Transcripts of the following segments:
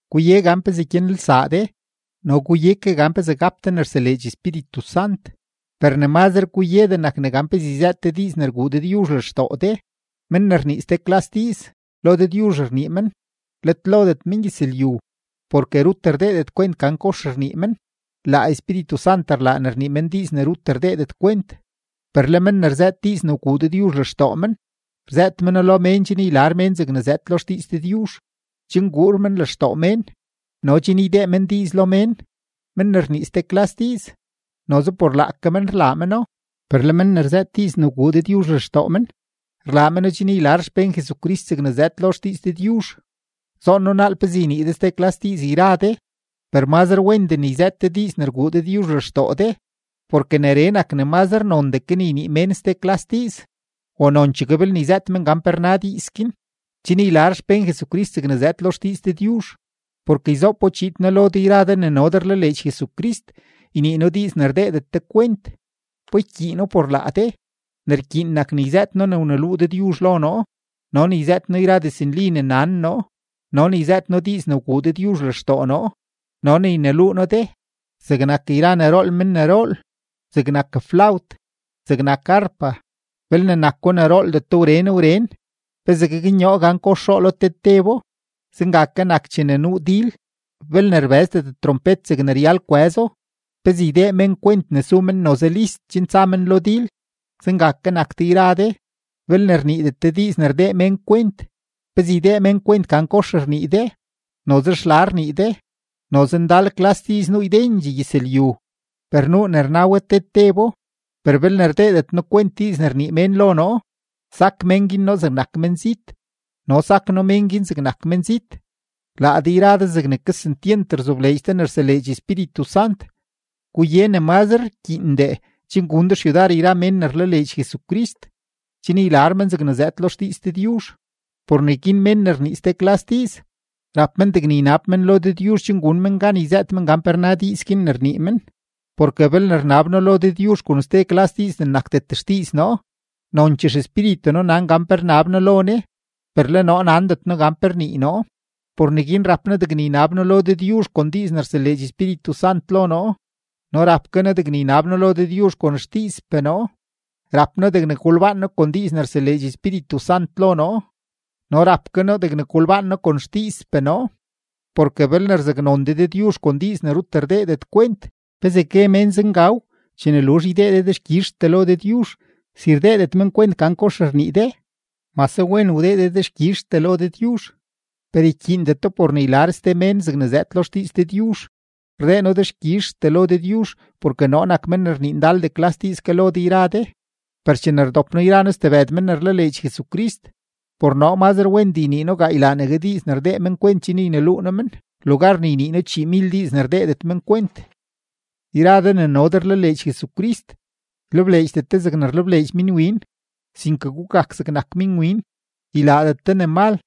Guye gan pezee gyanelsaa de no guye ke gan pezee gap de ne rseleedx Espíritu Sant, per ne mazre guyedee nak ne gan pezee yzëët de diiz ne rguu Dëdyuzh lextoo de. Men ne rnii ste klas diiz, lo Dëdyuzh rnii men, let lodet mengyëzlyu, porke rut rdeedet kwent gan kox rnii men. Laa Espíritu Sant rlaa ne rnii men diiz ne rut rdeedet kwent. Per le men ne rzëët diiz ne wguu Dëdyuzh lextoo men, rzëët meno lo mén chen ylar mén zegne zëëd lo xdiiz Dëdyuzh, chen guur men lextoo mén, no chen ydee men diiz lo mén. Men ne rnii ste klas diiz, noze por laake men rlaa meno, per le men ne rzëët diiz ne wguu Dëdyuzh lextoo men, rlaa meno chen ylar xpén Jesucrist zegne zëëd lo xdiiz Dëdyuzh. Zoon noo naal pezee ynii de ste klas diiz yra de, per mazre wendee ne yzëët de diiz ne rguu Dëdyuzh lextoo de; porke neree nak ne mazre nondee ke ne ynii mén ste klas diiz o nonchegue belne yzëët men gan pe rna diiz guin, chen ylar xpén Jesucrist zegne zëëd lo xdiiz Dëdyuzh. Porke yzoopo chiid noo lo de yra de ne no de rlaleedx Jesucrist ynii noo diiz ne rdeedet de kwent, ¿pa ykyiino por laa de? Ne rkyiin nak ne yzëët noo ne wluu Dëdyuzh lo noo, no ne yzëët noo yra diznli ne nan noo, no ne yzëët noo diiz ne wguu Dëdyuzh lextoo noo, no ne yneluu noo de. Zegnak yra ne rool men ne rool, zegnak flawt, zegnak arpa, belne nako ne rooldeto wren wren, ¿pezee gaknyoo gan kox roolo te tebo? Zenga ke nak chene nuu dil, belne rbëzdet trompet zegne ryal kwëzo, ¿pezee ydee mén kwent ne su men noze list chen tsa men lo dil? Zenga ke nak de yra de: belne rniidet de diiz ne rdee mén kwent, ¿pezee ydee men kwent gan kox rnii de? Noze xla rnii de. Noze ndal klas diiz nuu ydendxee gyëzlyu, per nuu ne rna we te tebo. Per belne rdeedet noo kwent diiz ne rnii mén lo noo, sak mén guin noo zegnak menzit, no sak noo mén guin zegnak menzit. Laa de yra de zegne kesentyent rzobleedx de ne rseleedx Espíritu Sant, guye ne mazre rkyiindee chen gun de xyudar yra mén ne rlaleedx Jesucrist, chen ylar men zegne zëëd lo xdiiz Dëdyuzh. Por neguin mén ne rnii ste klas diiz, rap men degne ynab men lo Dëdyuzh chen gun men gan yzëët men gan pe rna diiz guin ne rnii men. Porke belne rnab noo lo Dëdyuzh kon ste klas diiz ne nakdet xdiiz noo, nonchee xespíritu noo nan gan pe rnab noo lo Ne, per le noo nandet noo gan pe rnii noo. Por neguin rap noo degne ynab noo lo Dëdyuzh kon diiz ne rseleedx Espíritu Sant lo noo, no rap ke noo degne ynab noo lo Dëdyuzh kon xdiizpee noo; rap noo degne golbaan noo kon diiz ne rseleedx Espíritu Sant lo noo, no rap ke noo degne golbaan noo kon xdiizpee noo. Porke belne rzaknon de Dëdyuzh kon diiz ne rut rdeedet kwent, ¿pezee gue mén “Zengaw” chene luzh ydee de dexkyizhtee lo Dëdyuzh, si rdeedet men kwent gan kox rnii de? Mase wen wdee de dexkyizhtee lo Dëdyuzh, per ykyiindeto por ne ylar ste mén zegne zëëd lo xdiiz Dëdyuzh. Rdee noo dexkyizhtee lo Dëdyuzh porke noo nak men ne rnii ndaldee klas diiz ke lo de yra de. Per chene rdop noo yra noo stebëd men ne rlaleedx Jesucrist, por noo mazre wendee ynii noo gaaylaanegue diiz ne rdee men kwent chen yneluu noo men, lugar ne ynii noo chiimil diiz ne rdeedet men kwent. Yra de ne no de rlaleedx Jesucrist, ylebleedxdet de zegne rlebleedx minwin, sinke gugak zegnak minwin, ylaadet de ne mal,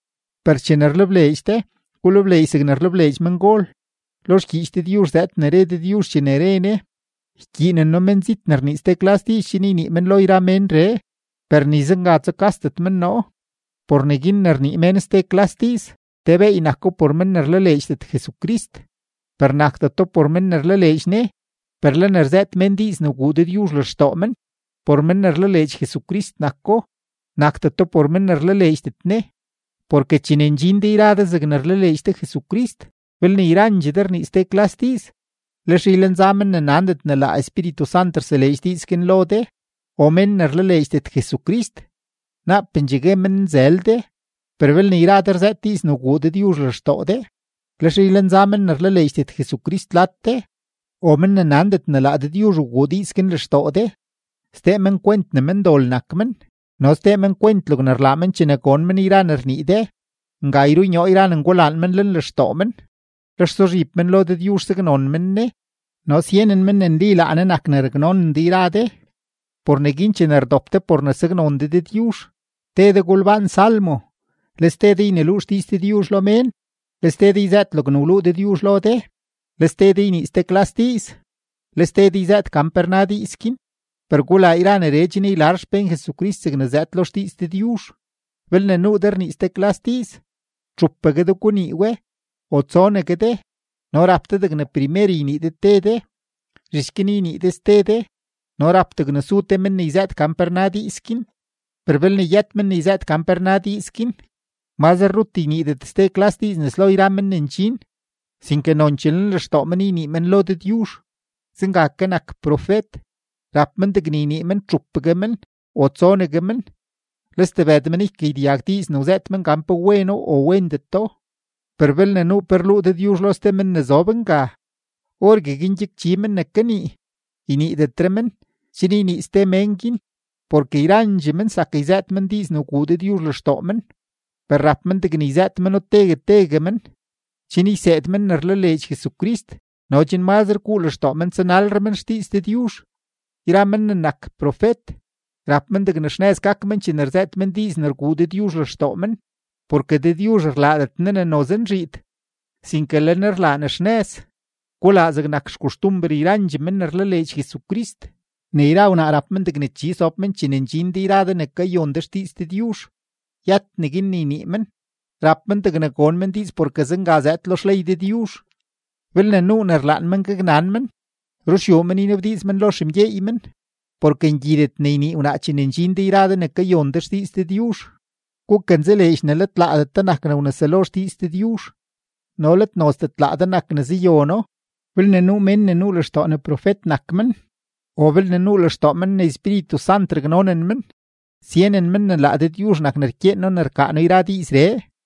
per chene rlebleedx de, gulebleedx zegne rlebleedx mengol. Lo xgyiich Dëdyuzh zëëd ne re Dëdyuzh chene re Ne: “Ykyiinen noo menzit ne rnii ste klas diiz chen ynii men lo yra ménree; per ni zenga tsukasdet men noo.” Por neguin, ne rnii mén ste klas diiz, te beey nako por men ne rlaleedxdet Jesucrist, per nakdeto por men ne rlaleedx Ne. Per le ne rzëët mén diiz ne wguu Dëdyuzh lextoo men, por men ne rlaleedx Jesucrist nako; nakdeto por men ne rlaleedxdet Ne. Porke chene ndxin de yra de zegne rlaleedx de Jesucrist, belne yrandxee de rnii ste klas diiz, lex ylenza men ne nandet ne laa Espíritu Sant rseleedx diiz guin lo de o mén ne rlaleedxdet Jesucrist, naapendxee gue men nzël de. Per belne yra de rzëët diiz ne wguu Dëdyuzh lextoo de, lex ylenza men ne rlaleedxdet Jesucrist lad de o men ne nandet ne laa Dëdyuzh wguu diiz guin lextoo de, sdee men kwent ne mendol nak men no sdee men kwent logne rlaa men chene gon men yra ne rnii de; nga yrunyoo yra ne ngulaan men lenlextoo men; lex suzhib men lo Dëdyuzh saknon men Ne no syenen men ne nli laa Ne nak ne raknonen de yra de. Por neguin chene rdop de por ne saknon de Dëdyuzh, te de golbaan salmo, le ste de yneluu xdiiz Dëdyuzh lo mén, le ste de yzëët logne wluu Dëdyuzh lo de, le ste de ynii ste klas diiz, le ste de yzëët gan pe rna diiz guin. Per gulaa yra neree chen ylar xpén Jesucrist zegne zëëd lo xdiiz Dëdyuzh. Belne nuu de rnii ste klas diiz, txupegue de gunii we o tsonegue de no rap de degne primer ynii de te de, zhich guin ynii de ste de; no rap degne su te men ne yzëët gan pe rna diiz guin. Per belne yët men ne yzëët gan pe rna diiz guin, mazre rut yniidet ste klas diiz nes lo yra men ne ndxin, sinke nonchee lenlextoo men ynii men lo Dëdyuzh. Zenga ke nak profet, rap men degne ynii men txupegue men o tsonegue men, le stebëd men ykagyedyag diiz ne wzëët men gan pe weno o wendeto. Per belne nuu pe rluu Dëdyuzh lo ste men ne zob nga, orgueguin gyakchi men ne kanii, yniidetre men, chen ynii ste men guin. Porke yrandxee men zak yzëët men diiz ne wguu Dëdyuzh lextoo men, per rap men degne yzëët meno tegue tegue men, chen yseed men ne rlaleedx Jesucrist no chen mazre guu lextoo men tsanalre men xdiiz Dëdyuzh. Yra men ne nak profet, rap men degne xnëz gak men chene rzëët men diiz ne rguu Dëdyuzh lextoo men, porke Dëdyuzh rlaadet Ne ne noze nzhiid, sinke le Ne rlaa ne xnëz. Gulaa zegnak xkoxtumber yrandxee men ne rlaleedx Jesucrist, ne yra wnaa rap men degne chi sob men chene ndxin de yra de ne kayon de xdiiz Dëdyuzh, yët neguin ne ynii men; rap men degne gon men diiz porke zenga zëëd lo xley Dëdyuzh. Belne nuu ne rlaan men gaknan men, ruxyuu men ynabdiiz men lo xemgyeey men, porke ngyidet ne ynii wnaa chene ndxin de yra de ne kayon de xdiiz Dëdyuzh. Gukanzaleedx ne let laadet de nak ne wneselo xdiiz Dëdyuzh no let nozdet laa de nak ne zayono. Belne nuu mén ne nuu lextoo ne profet nak men o belne nuu lextoo men ne Espíritu Sant raknonen men, syenen men ne laa Dëdyuzh nak ne rkyeen noo ne rkaa noo yra diizree.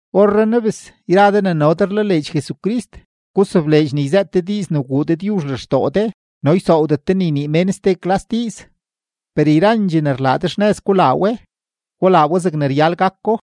Orrenaa bes, yra de ne no de rlaleedx Jesucrist, gusobleedx ne yzëët de diiz ne wguu Dëdyuzh lextoo de no ysoowdet de ne ynii mén ste klas diiz. Per yrandxee ne rlaa de, xnëz gulaa we, gulaa we zegne ryal gako.